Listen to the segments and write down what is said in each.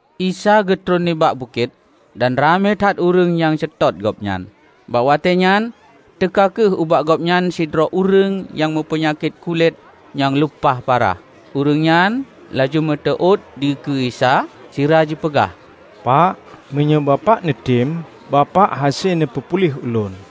Isa geutron nibak bukét, dan ramé that ureuëng nyang seutôt Gobnyan. Bak watée nyan teuka kheueh ubak Gobnyan sidroe ureuëng nyang meupeunyakét kulét nyang lumpah parah. Ureuëng nyan laju meuteuôt dikeue Isa, sira jipeugah, "Pak, meunyoe Bapak neutem, Bapak hase neupeupuléh ulôn."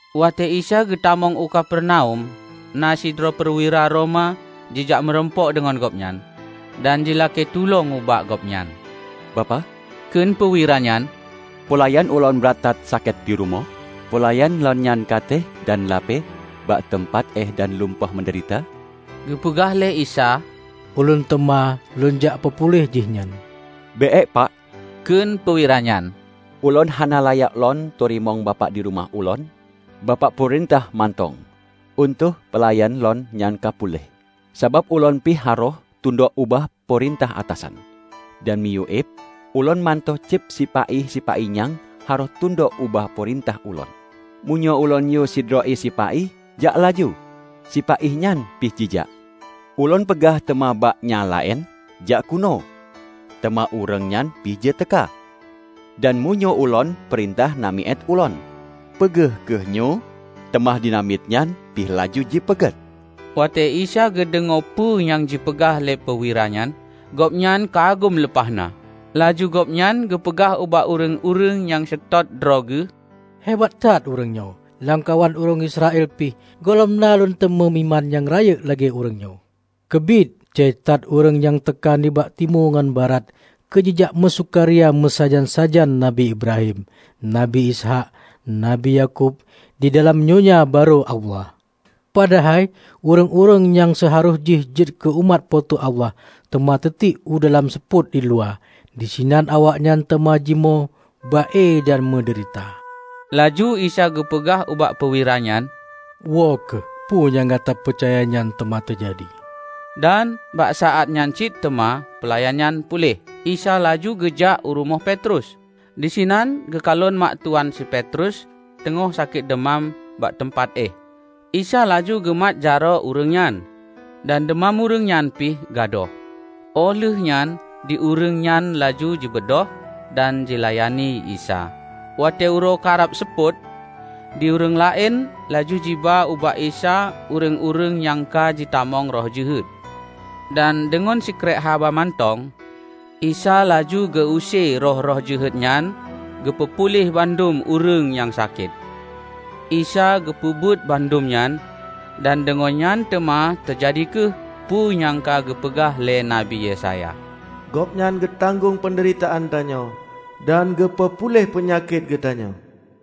Watée Isa geutamong u Kapernaum, na sidroe peuwira Roma jijak murumpok deungon Gobnyan, dan jilakée tulông ubak Gobnyan. "Bapak," kheun peuwira nyan, "peulayan ulôn brat that sakét di rumoh. Peulayan lôn nyan ka teuéh dan lapée bak teumpat éh dan lumpah meudeurita." Geupeugah lé Isa, "Ulôn teuma Lôn jak peupuléh jihnyan." "Bék Pak," Kheun peuwira nyan, "Ulôn hana layak lôn teurimong Bapak di rumoh ulôn. Bapak peurintah mantong. Euenteuk peulayan lôn nyan ka puléh. Sabab ulôn pih harôh tundok ubak peurintah atasan. Dan dimiyueb ulôn mantong cit sipa-i-sipa-i nyang harôh tundok ubak peurintah ulôn. Meunyoe ulôn yue sidroe sipa-i, "Jak laju!" sipa-i nyan pih jijak. Ulôn peugah teuma ubak nyang laén, 'Jak keunoe!' Teuma ureuëng nyan pih jiteuka; dan meunyoe ulôn peurintah namiet ulôn, 'Peugét kheueh nyoe!' Teuma di namiet nyan pih laju jipeugét." Watée Isa geudeungoe peue nyang jipeugah lé peuwira nyan, Gobnyan kagum lumpah na. Laju Gobnyan geupeugah ubak ureuëng-ureuëng nyang seutôt droe Geuh, "Hebat that ureuëng nyoe. Lamkawan ureuëng Israel pih gohlom na Lôn teumé iman nyang rayeuk lagée ureuëng nyoe! Keubiet! Jai that ureuëng nyang teuka nibak timu ngon barat keujijak meusukaria meusajan-sajan Nabi Ibrahim, Nabi Ishaq, Nabi Yakub di dalam Donya Barô Allah. Padahai ureuëng-ureuëng nyang seuharôh jih jeuet keu umat Po teu Allah teuma teutiek u dalam seupôt di luwa. Disinan awaknyan teuma jimoe ba-e dan meudeurita." Laju Isa geupeugah ubak peuwira nyan, "Woe kheueh, peue nyang gata peucaya nyan teuma teujadi." Dan bak saát nyan cit teuma peulayan nyan puléh. Isa laju geujak u rumoh Petrus. Disinan geukalon mak tuwan si Petrus teungoh sakét deumam bak teumpat éh. Isa laju geumat jaroe ureuëng nyan, dan deumam ureuëng nyan pih gadôh. Óh lheueh nyan di ureuëng nyan laju jibeudôh dan jilayani Isa. Watée uroe karab seupôt, di ureuëng laén laju jiba ubak Isa ureuëng-ureuëng nyang ka jitamong roh jeuhet. Dan deungon sikrék haba mantong, Isa laju geu-use roh-roh jeuhet nyan geupeu puléh bandum ureuëng nyang sakét. Isa geupeubuet bandum nyan, dan deungon nyan teuma teujadi kheueh peue nyang ka geupeugah lé Nabi Yesaya, "Gobnyan geutanggong peundeuritaan tanyoe dan geupeu puléh peunyakét geutanyoe."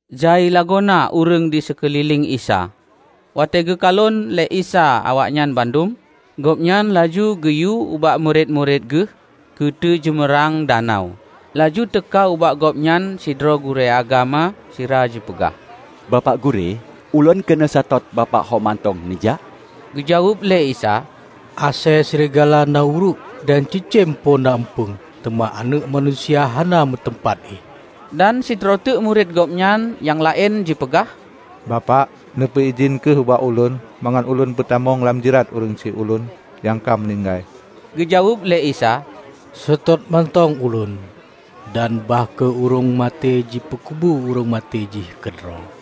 Jai lagoena ureuëng di seukeulileng Isa. Watée geukalon lé Isa awaknyan bandum, Gobnyan laju geuyue ubak murit-murit Geuh keuteujeumeurang danau. Laju teuka ubak Gobnyan sidroe gurée agama sira jipeugah, "Bapak Gurée, ulôn keuneuk seutôt Bapak ho mantong neujak!" Geujaweueb lé Isa, "Asée srigala na uruek, dan cicém po na eumpung, teuma Aneuëk Manusia hana meuteumpat éh." Dan sidroe teuk murit Gobnyan nyang laén jipeugah, "Bapak, neupeu-idhin kheueh ubak Ulôn mangat lôn peutamong lam jrat ureuëng syiek ulôn nyang ka meuninggai." Geujaweueb lé Isa, "Seutôt mantong ulôn, dan bah kheueh ureuëng maté jipeukubu ureuëng maté jih keudroe."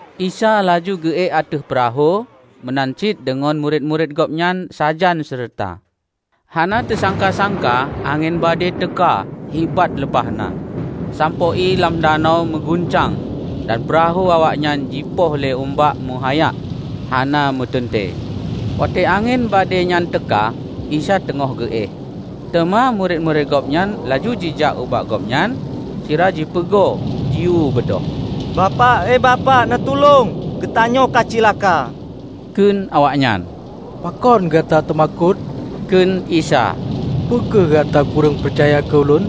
Isa laju geu-ék ateueh peurahô meunan cit deungon murit-murit Gobnyan sajan seureuta. Hana teusangka-sangka angén badée teuka hibat lumpah na sampoe ié lam danau meuguncang dan peurahô awaknyan jipoh lé umbak meuhayak hana meuteuntée. Watée angén badée nyan teuka Isa teungoh geuéh. Teuma murit-murit Gobnyan laju jijak ubak Gobnyan sira jipugo jiyue beudôh. "Bapak! He Bapak! Neutulông! Geutanyoe ka cilaka!" kheun awaknyan. "Pakon gata teumakot?" kheun Isa. "Peu kheueh gata kureueng peucaya keu Ulôn!"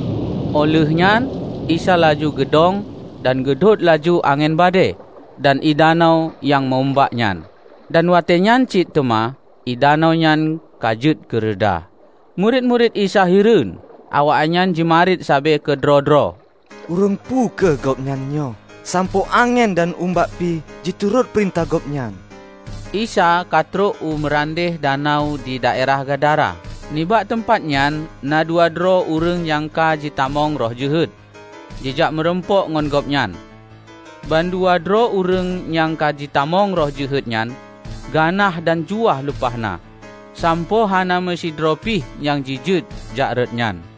Óh lheueh nyan Isa laju geudong dan geudhôt laju angén badée dan ié danau nyang meu-umbak nyan. Dan watée nyan cit teuma ié danau nyan ka jeuet keureda. Murit-murit Isa hireuen. Awaknyan jimarit sabe keudroe-droe, "Ureuëng peu kheueh Gobnyan nyoe, sampoe angén dan umbak pih jiturot peurintah Gobnyan!" Isa ka trok u meurandeh danau di daerah Gadara. Nibak teumpat nyan na dua droe ureuëng nyang ka jitamong roh jeuhet jijak murumpok ngon Gobnyan. Ban dua droe ureuëng nyang ka jitamong roh jeuhet nyan ganah dan juwah lumpah na, sampoe hana meusidroe pih nyang jijeuet jak rot nyan.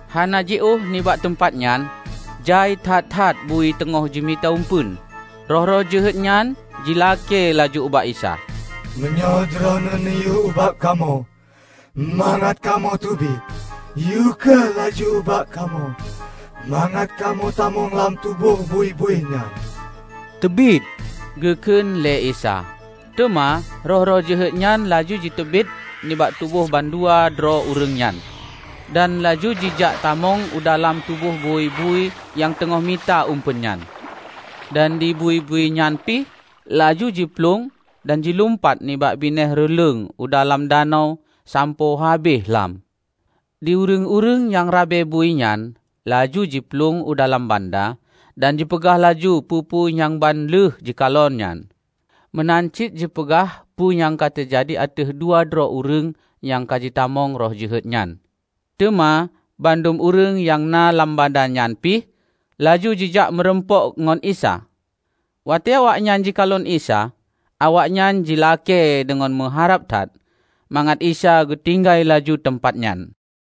Hana jiôh nibak teumpat nyan, jai that-that bui teungoh jimita uempeuen. Roh-roh jeuhet nyan jilakée laju ubak Isa, "Meunyoe Droeneueh neuyue ubak kamoe mangat kamoe teubiet, yue kheueh laju ubak kamoe mangat kamoe tamong lam tuboh bui-bui nyan." "Teubiet!" Geukheun lé Isa. Teuma roh-roh jeuhet nyan laju jiteubiet nibak tuboh bandua droe ureuëng nyan, dan laju jijak tamong u dalam tuboh bui-bui nyang teungoh mita uempeuen nyan. Dan di bui-bui nyan pih laju jiplueng dan jilumpat nibak binéh reuleueng u dalam danau sampoe habéh lham. Di ureuëng-ureuëng nyang rabe bui nyan laju jiplueng u dalam banda dan jipeugah laju peue-peue nyang ban lheueh jikalon nyan, meunan cit jipeugah peue nyang ka teujadi ateueh dua droe ureuëng nyang ka jitamong roh jeuhet nyan. Teuma bandum ureuëng nyang na lam banda nyan pih laju jijak meurumpok ngon Isa. Watée awaknyan jikalon Isa, awaknyan jilakée deungon meuharab that mangat Isa geutinggai laju teumpat nyan.